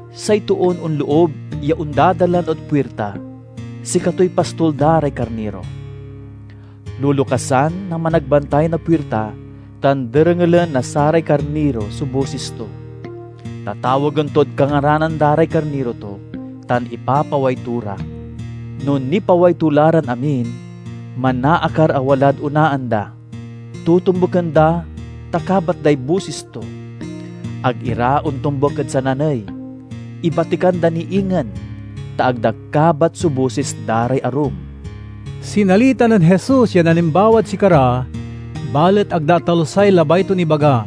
Say toon onloob ya ondadalan ed puirta, sikatoy pastol da ray karniro. Lolokasan na managbantay na puirta tan derengelen na saray karniro so bosis to. Tatawagen tod kangaranan da ray karniro to, tan ipapaway to ra. No nipaway to la ran amin, manaakar a walad onaan da. Totombuken da ta kabat day bosis to. Ag ira ontombuk ed sananey; ibatikan da ni ingen, ta ag da kabat so bosis da ray arum." Sinalita nen Jesus yan alimbawad sikara, balet ag da atalusay labay ton ibaga.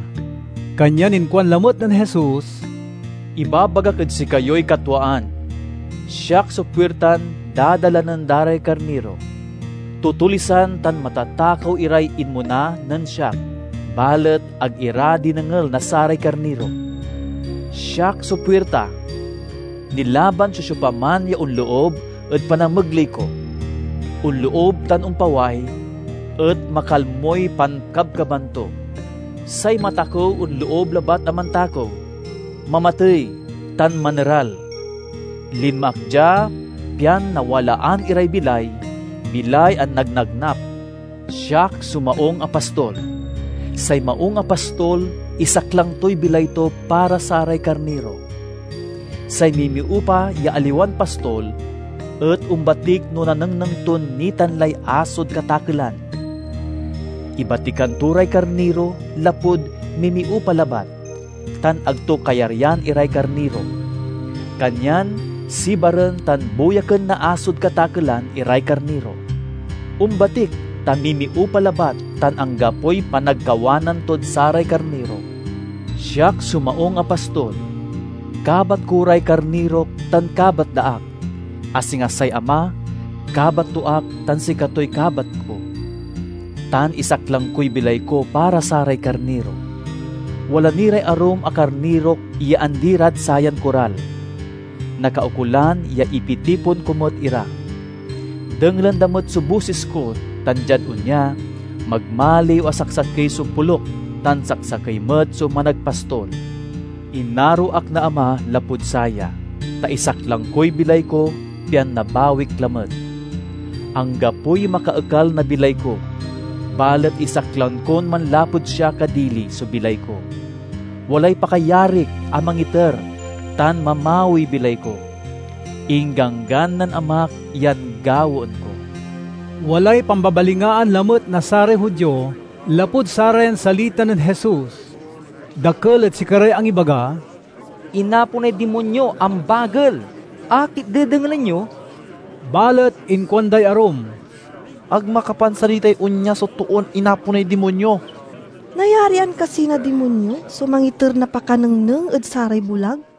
Kanyan inkuan lamet nen Jesus, "Ibabagak ed sikayoy katwaan: siak so puirtan dadalanen da ray karniro. Tutulisan tan matatakew iray inmona nen siak, balet ag ira dinengel na saray karniro. Siak so puirta. Nilaban so siopaman ya onloob ed panamegley ko; onloob tan ompaway, et makalmoy pankabkaban to. Say matakew onloob labat a mantakew, mamatey, tan maneral. Linma ak dia, pian nawalaan iray bilay, bilay a nagnagnap. "Siak so maung a pastol. Say maung a pastol isaklang toy bilay to para saray karniro. Say mimiupa ya aliwan pastol et ombatik no nanengneng ton nitan lay asod katakelan. Ibatikan to ray karniro lapud mimiupa labat, tan ag to kayaryan iray karniro. Kanyan sibaren tan buyaken na asod katakelan iray karniro. Ombatik ta mimiupa labat tan anggapoy panagkawanan tod saray karniro. Siak so maung a pastol. Kabat ko ray karnirok tan kabat da ak, a singa say Ama kabat to ak tan sikatoy kabat ko. Tan isaklang koy bilay ko para saray karniro. Wala ni ray arum a karnirok ya andi rad sayan koral. Nakaukolan ya ipitipon ko met ira. Dengelen da met so bosis ko tan diad onya, magmaliw a saksakey so poluk tan saksakey met so managpastol. "Inaro ak na Ama lapud saya, ta isaklang koy bilay ko pian nabawik lamet. Anggapoy makaekal na bilay ko, balet isaklang kon manlapud siak a dili so bilay ko. Walay pakayarik a mangiter tan mamawiy bilay ko. Ingganggan nen Amak yan gawaen ko." Walay pambabalingaan lamet na saray Judio lapud sarayan salita nen Jesus. Dakel ed sikaray angibaga, "Inaponay dimonyo! Ambagel! Akit dedengelen yo?" Balet inkuanday arum, "Ag makapansalitay onya so toon inaponay dimonyo! Nayarian kasi na dimonyo so mangiter na pakanengneng ed saray bulag?"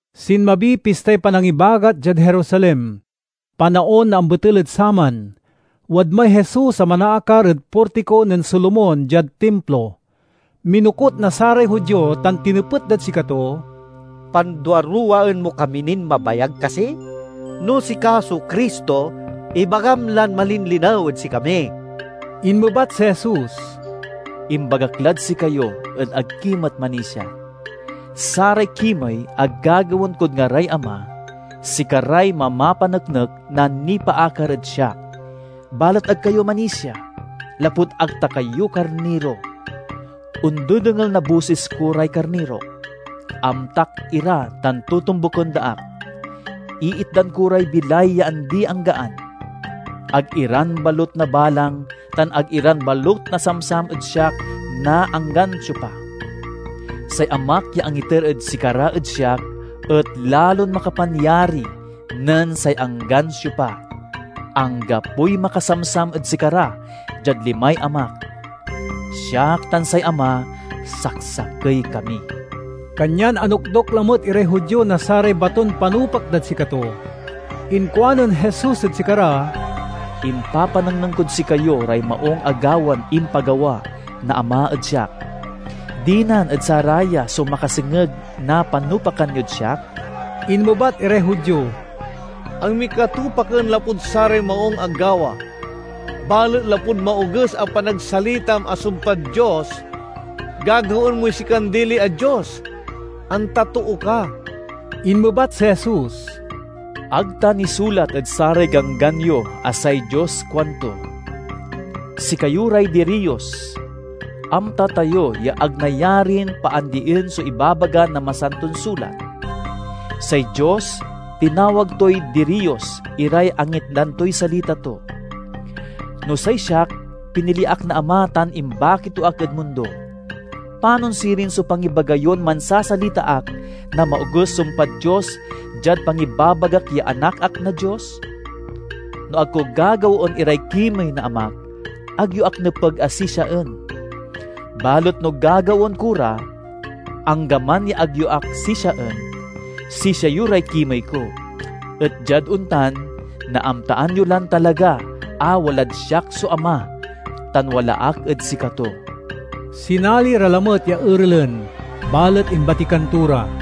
Sinmabiy Pistay Panangibagat diad Jerusalem. Panaon na ambetel ed saman. Wadmay Jesus a manaakar ed Portiko nen Solomon diad Timplo. Minokut na saray Judio tan tinepet dad sikato, "Panduaruwaen mo kami nin mabayag kasi? No sika so Cristo, ibagam lan malinlinew ed sikami." Inmebat si Jesus, "Imbagak lad sikayo et ag ki met manisia. Saray kimey a gagawaen kod ngaray Ama, sikaray mamapaneknek na nipaakar ed siak. Balet ag kayo manisia, lapud ag ta kayo karniro. Ondedengel na bosis ko ray karnirok. Amtak ira tan totombuken da ak. Iitdan ko ray bilay ya andi-anggaan. Ag iran balut nabalang tan ag iran balut nasamsam ed siak na anggan siopa. Say Amak ya angiter ed sikara ed siak et lalon makapanyari nen say anggan siopa. Anggapoy makasamsam ed sikara diad limay Amak. Siak tan say Ama, saksakey kami." Kanyan anokdok lamet iray Judio na saray baton panupak dad sikato. Inkuanen Jesus ed sikara, "Impapanengneng kod sikayo ray maung a gawan impagawa na Ama ed siak. Dinan ed saraya so makasengeg na panupakan yod siak?" Inmebat iray Judio, "Ag mi ka tupaken lapud saray maung a gawa, balet lapud maoges a panagsalitam a sumpad Dios! Gagawaen moy sikan dili a Dios, anta too ka!" Inmebat si Jesus, "Ag ta nisulat ed saray Ganggan yo a say Dios kuanto, 'Sikayo ray diriyos'? Amta tayo ya ag nayarin paandien so ibabaga na Masanton Sulat. Say Dios tinawag toy diriyos iray angitdan toy salita to. No say siak, pinili ak na Ama tan imbaki to ak ed mundo. Panon sirin so pangibaga yon mansasalita ak na maoges sumpad Dios diad pangibabagak ya Anak ak na Dios? No ag ko gagawaen iray kimey na Amak, ag yo ak nepeg a sisiaen. Balet no gagawaen ko ra, anggaman ya ag yo ak sisiaen, sisia yo ray kimey ko. Et diad ontan, naamtaan yo lan talaga a walad siak so Ama, tan wala ak ed sikato." Sinali ra lamet ya erelen, balet imbatikan to ra.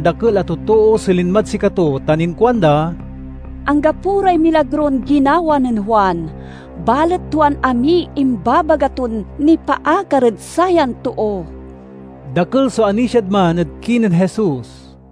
dakel a totoo so linmad sikato tan inkuanda, "Anggapo ray milagron ginawa nen Juan, balet tuan amiy imbabaga ton nipaakar ed sayan too." Dakel so anisiad man ed kinen Jesus.